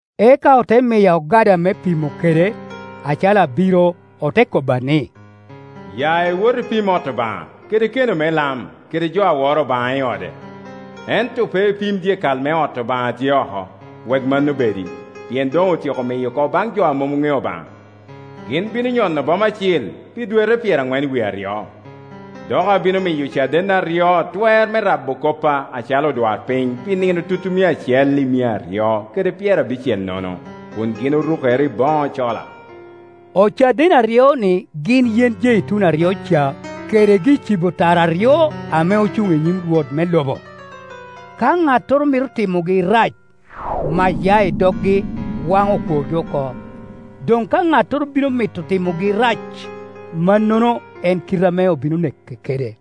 Eka ote miya ogada me pimo kede, acalo abiro, ote kobba ni, “Ya iwot ipim ot Obaŋa, kede keno me lam, kede jo a woro Obaŋa i ode. Ento pe ipim dyekal me ot Obaŋa a tye oko, wek mano bedi, pien doŋ otyeko miyo oko baŋ jo a mom ŋeo Obaŋa, gin bino nyono boma acil pi dwete pyeraŋwen wie aryo. Dok abino miyo ocadenna aryo twer me rabo koppa acalo odwarpiny pi nino tutumia acel i mia aryo kede pyerabicel nono, kun gin orukere i boŋo cola.” Ocaden aryo-ni gin yen jeituni aryo ca kede gi-cibo tara aryo ame ocuŋ i nyim Rwot me lobo. Ka ŋattoro mito timogi rac, mac ya i doggi, waŋo okworgi oko; doŋ ka ŋattoro bino mito timogi rac, mannono en kite ame obino neke kede.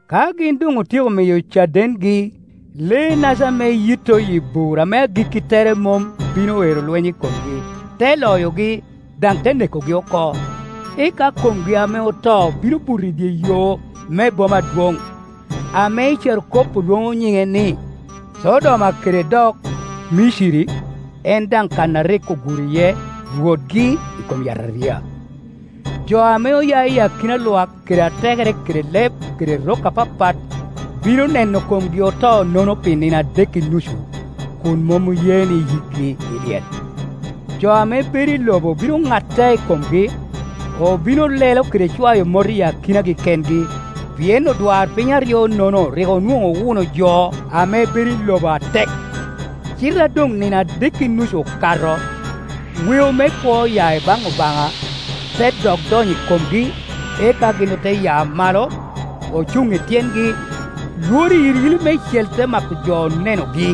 Ka gin doŋ otyeko miyo cadengi, lee-naca ame yitto iyi bur ame agikki tere mom bino ero lweny i komgi, te loyogi, daŋ te nekogi oko. Eka komgi ame oto bino buto i dye yo me boma adwoŋ, ame i carokop olwoŋo nyiŋe ni, Codoma kede dok, Miciri, en daŋ kan a rik oguro iye Rwotgi i kom yataria. Jo ame oya i akina lwak kede atekere kede leb kede rok apapat bino neno komgi oto-nono pi nino adek i nucu, kun mom oye ni yikgi i lyel. Jo ame bedo i lobo bino ŋatte i komgi, obino lelo kede cwayo mot i akinagi kengi, pien odwarpiny aryo-nono rik onwoŋo owuno jo ame bedo i lobo atek. Cite a doŋ nino adek i nucu okato, weo me kwo oya i baŋ Obaŋa te dok donyo i komgi, eka gin ote ya malo, ocuŋ i tyengi, lworo iyiliyili meicel te mako jo onenogi.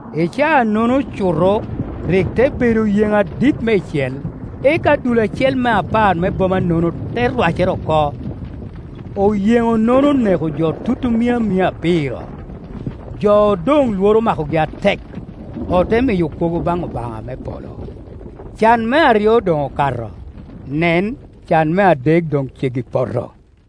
I caa-nono cuto rik te bedo oyeŋo adit meicel, eka dul acel me apar me boma-nono te rwacere oko. Oyeŋo-nono oneko jo tutumia mia abiro, jo odoŋ lworo omakogi atek, ote miyo kwogo baŋ Obaŋa me polo. Can me aryo doŋ okato; nen, can me adek doŋ ceggi poto.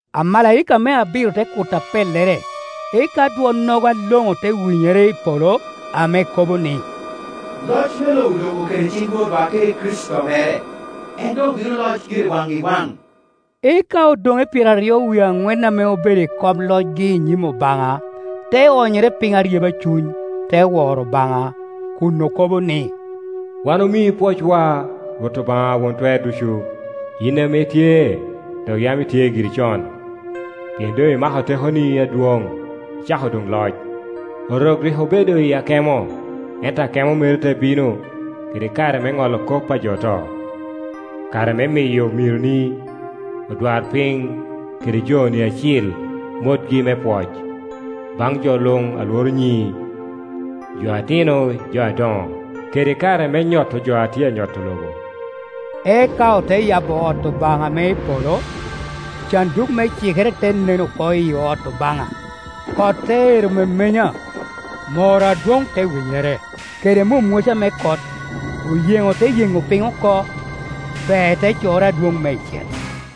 Amalaika me abiro te kuto apellere, eka dwonnogo aloŋo te winyere i polo ame kobo ni, “Loc me lobo doŋ oketo i ciŋ Rwotwa kede Kricito mere, en doŋ bino loc gire waŋ i waŋ.” Eka odoŋe pyeraryo wie aŋwen ame obedo i kom locgi i nyim Obaŋa te onyere piny aryeba cuny, te woro Obaŋa kun okobo ni, “Wan omii pwocwa, Rwot Obaŋa Won Twer Ducu, yin ame itye dok yam itye giri con, pien doŋ imako tekoni adwoŋ, icako doŋ Ioc, Orok rik obedo i akemo, ento akemo meri te bino, kede kare me ŋolo kop a jo oto, kare me miyo omironi, odwarpiny kede joni acil, motgi me pwoc, baŋ jo luŋ a lworo nyiŋi, jo atino i jo adoŋo, kede kare me nyoto jo a tye a nyoto lobo.” Eka ote yabo ot Obaŋa ame i polo, canduk me cikere te nen oko iyi ot Obaŋa. Kot te ero memenya, mor adwoŋ te winyere, kede mwomwoca me kot, oyeŋo te yeŋo piny oko, pee te corre adwoŋ meicel.